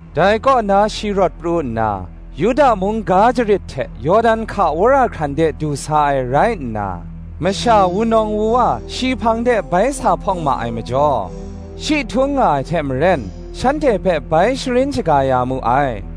Dai kaw na shi rawt pru nna, Yuda mung ga jarit hte Yawdan hka wora hkran de du sa ai rai nna, masha wunawng wuwa shi hpang de bai sa hpawng ma ai majaw, shi htung nga ai hte maren, shanhte hpe bai sharin shaga ya mu ai.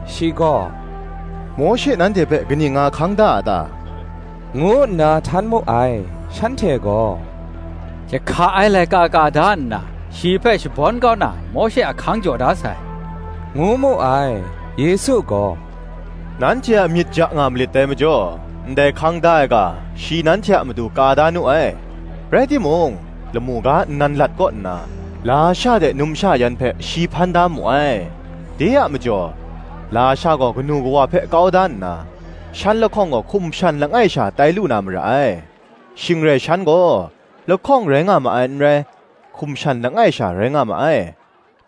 Shi gaw “Mawshe nanhte hpe kaning nga hkang da a ta?” ngu nna htan mu ai. Shanhte gaw, “Jahka ai laika ka da nna, shi hpe shabawn kau na, Mawshe ahkang jaw da sai,” ngu mu ai. Yesu gaw, “Nanhte a myit ja nga malit dai majaw, ndai hkang da ai ga, shi nanhte a matu ka da nu ai. Rai timung, lamu ga nnan lat kaw nna, lasha hte numsha yan hpe shi hpan da mu ai. De a majaw lasha gaw kanu kawa hpe kau da nna, shan lahkawng gaw hkum shan langai sha tai lu na mara ai. Shing rai shan gaw, lahkawng rai nga ma ai n rai, hkum shan langai sha rai nga ma ai.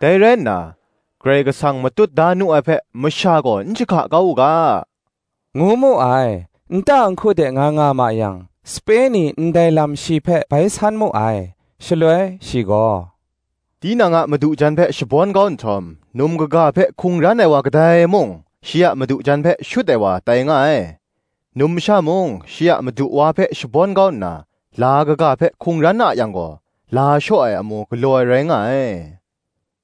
Dai rai nna, Karai Kasang matut da nu ai hpe, masha gaw n jahka kau u ga,” ngu mu ai. Nta nhku de nga nga ma yang, sape ni ndai lam shi hpe bai san mu ai. Shaloi shi gaw, “Tinang a madu jan hpe shabawn kau nhtawm, num kaga hpe hkungran ai wa kadai mung, shi a madu jan hpe shut ai wa tai nga ai: numsha mung shi a madu wa hpe shabawn kau nna, la kaga hpe hkungran a yang gaw, la shaw ai amu galaw ai rai nga ai,”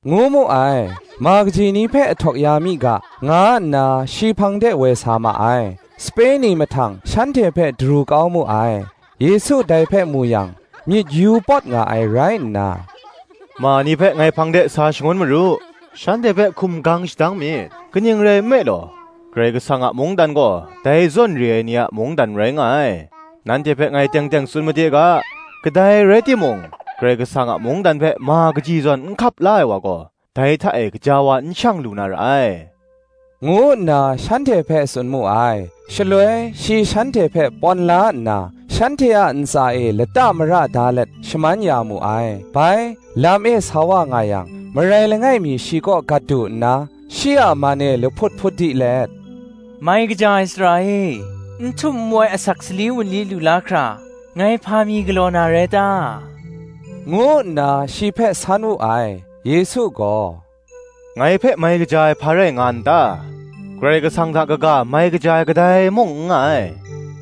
ngu mu ai. Ma kaji ni hpe ahtawk ya mi ga, nga nna shi hpang de woi sa ma ai: sape ni mahtang shanhte hpe daru kau mu ai. Yesu dai hpe mu yang, myit yu pawt nga ai rai nna, “Ma ni hpe ngai hpang de sa shangun maru; shanhte hpe hkum gang shadang myit; kaning rai nme law, Karai Kasang a mungdan gaw, dai zawn re ai ni a mungdan rai nga ai. Nanhte hpe ngai teng teng tsun made ga, Kadai rai timung Karai Kasang a mungdan hpe ma kaji zawn n hkap la ai wa gaw, dai hta e gaja wa n shang lu na ra ai,” ngu nna shanhte hpe tsun mu ai. Shaloi shi shanhte hpe pawn la nna, shanhte a ntsa e lata mara da let, shaman ya mu ai. Bai, lam e sa wa nga yang, marai langai mi shi kaw gat du nna, shi a man e lahput hput di let, “Mai kaja ai Sara e, n htum n wai asak sali wunli lu la hkra, ngai hpa mi galaw na rai ta?” ngu nna shi hpe san wu ai. Yesu gaw, “Ngai hpe mai kaja ai hpa rai nga n ta? Karai Kasang hta kaga mai kaja ai kadai mung n nga ai.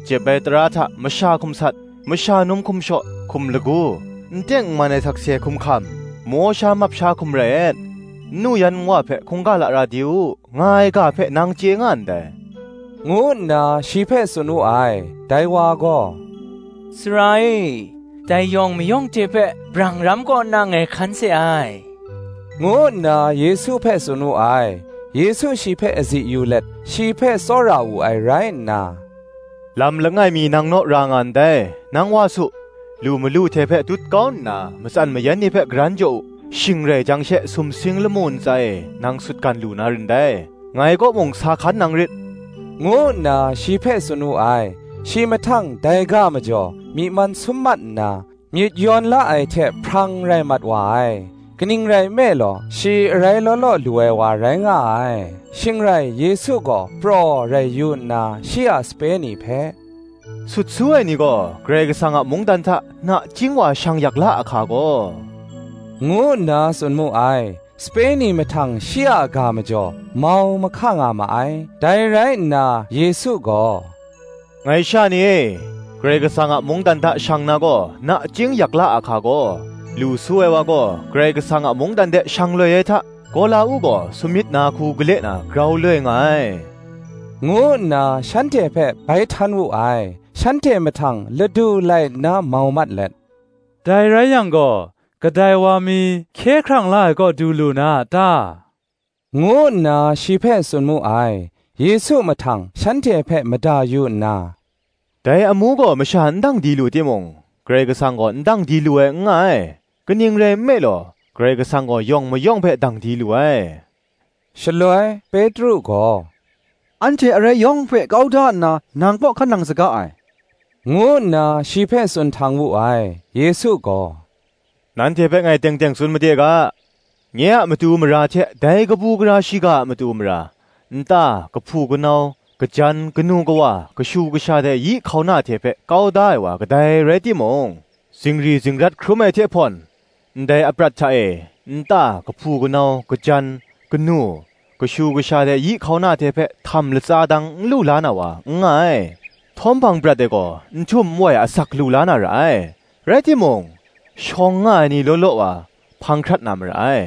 Jep ai tara hta, Masha hkum sat, masha num hkum shaw, hkum lagu, n teng n man ai sakse hkum hkam, maw sha map sha hkum rai et, nnu yan nwa hpe hkungga lara di u, nga ai ga hpe nang chye nga ndai,” ngu nna shi hpe tsun wu ai. Dai wa gaw, “Sara e, dai yawng mayawng hte hpe, brang ram kaw nna, ngai hkan se ai,” ngu nna Yesu hpe tsun wu ai. Yesu shi hpe azi yu let, shi hpe tsawra wu ai rai nna, “Lam langai mi nang naw ra nga ndai: nang wa su, lu malu hte hpe dut kau nna matsan mayan ni hpe karan jaw u; shing rai jang she sumsing lamu ntsa e nang sutgan lu na rin dai; ngai kaw mung sa hkan nang rit,” ngu nna shi hpe tsun wu ai. Shi mahtang dai ga majaw, myi man sum mat nna, myit yawn la ai hte hprang rai mat wa ai: kaning rai nme law, shi arai law law lu ai wa rai nga ai. Shing rai Yesu gaw praw rai yu nna, shi a sape ni hpe, “Sut su ai ni gaw, Karai Kasang a mungdan hta, nachying wa shang yak la a hka gaw!” ngu nna tsun mu ai. Sape ni mahtang shi a ga majaw, mau mahka nga ma ai. Dai rai nna Yesu gaw, “Ngai sha ni e, Karai Kasang a mungdan hta shang na gaw, nachying yak la a hka gaw. Lu su ai wa gaw, Karai Kasang a mungdan de shang loi ai hta, gawla-uk gaw samyit na hku gale na grau loi nga ai,” ngu nna shanhte hpe bai htan wu ai. Shanhte mahtang ladu lai nna mau mat let, “Dai rai yang gaw, kadai wa mi hkye hkrang la ai kaw du lu na a ta?” ngu nna shi hpe tsun mu ai. Yesu mahtang shanhte hpe mada yu nna, “Dai amu gaw masha n dang di lu timung, Karai Kasang gaw, n dang di lu ai n nga ai; kaning rai nme law, Karai Kasang gaw yawng mayawng hpe dang di lu ai.” Shaloi, Petru gaw, “Anhte arai yawng hpe kau da nna, nang kaw hkan nang saga ai,” ngu nna shi hpe tsun htang wu ai. Yesu gaw, Nanhte hpe ngai teng teng tsun made ga, Nye a matu mara hte, dai kabu gara shiga a matu mara, nta, kahpu kanau, kajan, kanu kawa, kashu kasha hte yi hkauna hte hpe kau da ai wa kadai rai timung, zingri zingrat hkrum ai hte hpawn, ndai aprat hta e nta, kahpu kanau, kajan, kanu, kashu kasha hte yi hkauna hte hpe htam latsa dang, n lu la na wa, n nga ai: htawm hpang prat e gaw n htum n wai asak lu la na ra ai. Rai timung, shawng nga ai ni law law wa, hpang hkrat na mara ai;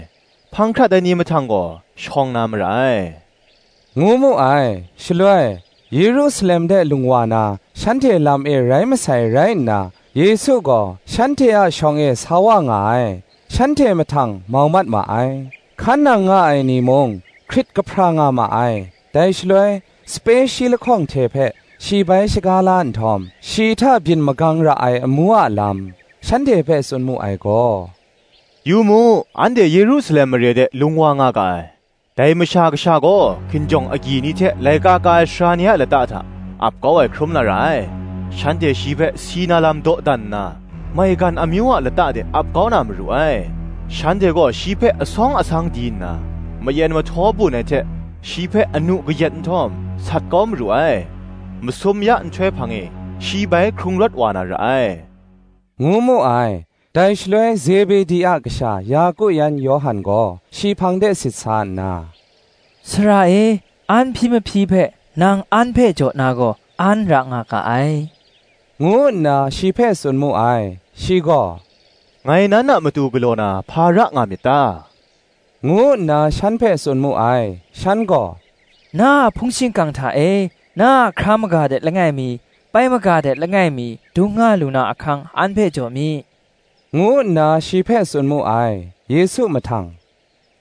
hpang hkrat ai ni mahtang gaw, shawng na mara ai,” ngu mu ai. Shaloi, Yerusalem de lung wa na, shanhte lam e rai masai rai nna, Yesu gaw shanhte a shawng e sa wa nga ai: shanhte mahtang mau mat ma ai: hkan nang nga ai ni mung, hkrit kahpra nga ma ai. Dai shaloi, sape shi lahkawng hte hpe, shi bai shaga la nhtawm, shi hta byin magang ra ai amu a lam, shanhte hpe tsun mu ai gaw, “Yu mu, anhte Yerusalem mara de lung wa nga ga ai; dai Masha Kasha gaw hkinjawng agyi ni hte laika ka ai sara ni a lata hta, ap kau ai hkrum na ra ai: shanhte shi hpe si na lam dawdan nna, maigan amyu a lata de ap kau na maru ai: shanhte gaw shi hpe asawng asang di nna, mayen mahtaw bun ai hte, shi hpe anu kayat nhtawm, sat kau na maru ai: masum ya nhtoi hpang e shi bai hkrung rawt wa na ra ai,” ngu mu ai. Dai shaloi Zebedi a kasha Yaku yan Yawhan gaw shi hpang de sit sa nna, “Sara e, an hpyi mahpyi hpe nang an hpe jaw na gaw, an ra nga ga ai,” ngu nna shi hpe tsun mu ai. Shi gaw, “Ngai nan a matu galaw na, hpa ra nga myit ta?” ngu nna shan hpe tsun mu ai. Shan gaw, “Na a hpung shingkang hta e, na a hkra maga de langai mi, pai maga de langai mi, dung nga lu na ahkang an hpe jaw mi,” ngu nna shi hpe tsun mu ai. Yesu mahtang,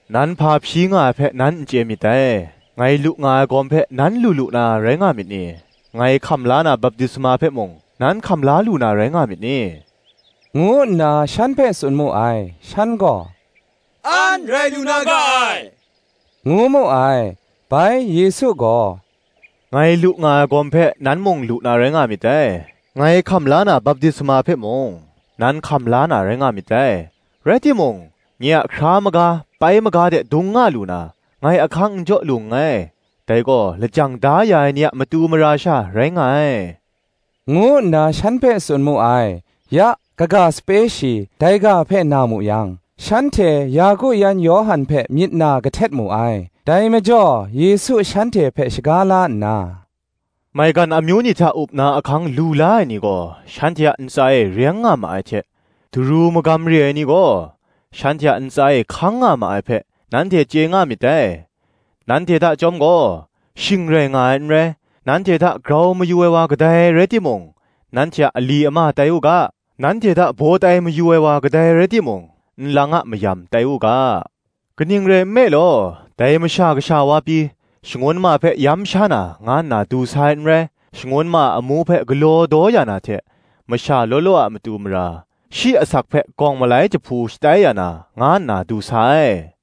“Nan hpa hpyi nga ai hpe, nan n chye myit dai. Ngai lu nga ai gawm hpe, nan lu lu na rai nga myit ni? ngai hkam la na baptisma hpe mung, nan hkam la lu na rai nga myit ni?” ngu nna shan hpe tsun mu ai. Shan gaw, “An rai lu na ga ai,” ngu mu ai. Bai Yesu gaw, “Ngai lu nga ai gawm hpe, nan mung lu na rai nga myit dai; ngai hkam la na baptisma hpe mung, nan hkam la na rai nga myit dai: rai timung, nye a hkra maga pai maga de dung nga lu na, ngai ahkang n jaw lu nngai; dai gaw, lajang da ya ai ni a matu mara sha, rai nga ai,” ngu nna shan hpe tsun mu ai. Ya, kaga sape shi, dai ga hpe na mu yang, shanhte Yaku yan Yawhan hpe myit na kahtet mu ai. Dai majaw Yesu shanhte hpe shaga la nna, “Maigan amyu ni hta up na ahkang lu la ai ni gaw, shanhte a ntsa e reng nga ma ai hte, daru magam re ai ni gaw, shanhte a ntsa e hkang nga ma ai hpe, nanhte chye nga myit dai. Nanhte hta chyawm gaw, shing rai nga ai n rai: nanhte hta grau mayu ai wa kadai rai timung, nanhte a ali ama tai u ga: nanhte hta baw tai mayu ai wa kadai rai timung, nlang a mayam tai u ga: kaning rai nme law, dai Masha Kasha wa pyi, shangun ma hpe yam sha na, nga nna du sa ai n rai; shangun ma a amu hpe galaw daw ya na hte, masha law law a matu mara, shi asak hpe gawng malai jahpu shatai ya na, nga nna du sa ai,”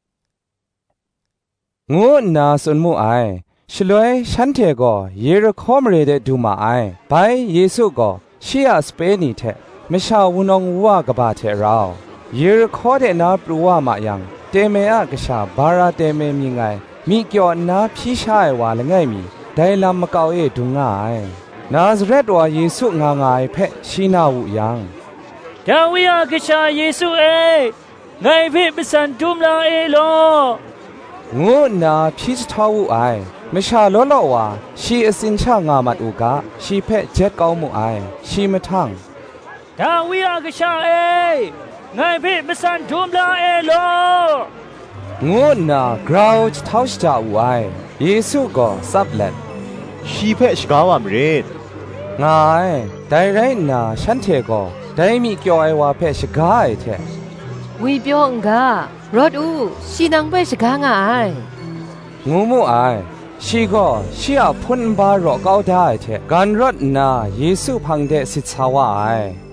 ngu nna tsun mu ai. Shaloi shanhte gaw Yerihko mare de du ma ai. Bai Yesu gaw, shi a sape ni hte, masha wunawng wuwa kaba hte rau, Yerihko de na pru wa ma yang, Teme a kasha Bara Teme mying ai, myi kyaw nna hpyi sha ai wa langai mi, dai lam makau e dung nga ai. Nazaret wa Yesu nga nga ai hpe, shi na wu yang, “Dawi a Kasha Yesu e, ngai hpe matsan dum la e law,” ngu nna hpyi jahtau wu ai. Masha law law wa, shi atsin sha nga mat u ga, shi hpe jet kau mu ai. Shi mahtang, “Dawi a Kasha e, ngai hpe matsan dum la e law,” ngu nna grau jahtau shaja wu ai. Yesu gaw, tsap let, “Shi hpe shaga wa marit,” nga ai. Dai rai nna shanhte gaw, dai myi kyaw ai wa hpe shaga ai hte, “Ngwipyaw n ga; rawt u, shi nang hpe shaga nga ai,” ngu mu ai. Shi gaw shi a hpun nba raw kau da ai hte, gan rawt nna Yesu hpang de sit sa wa ai.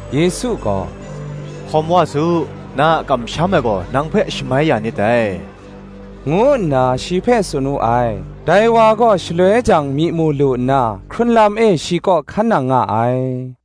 Yesu gaw, “Hkawm wa su; na a kamsham ai gaw nang hpe shamai ya nit dai,” ngu nna shi hpe tsun wu ai. Dai wa gaw shaloi jang myi mu lu nna, hkrun lam e shi kaw hkan nang nga ai.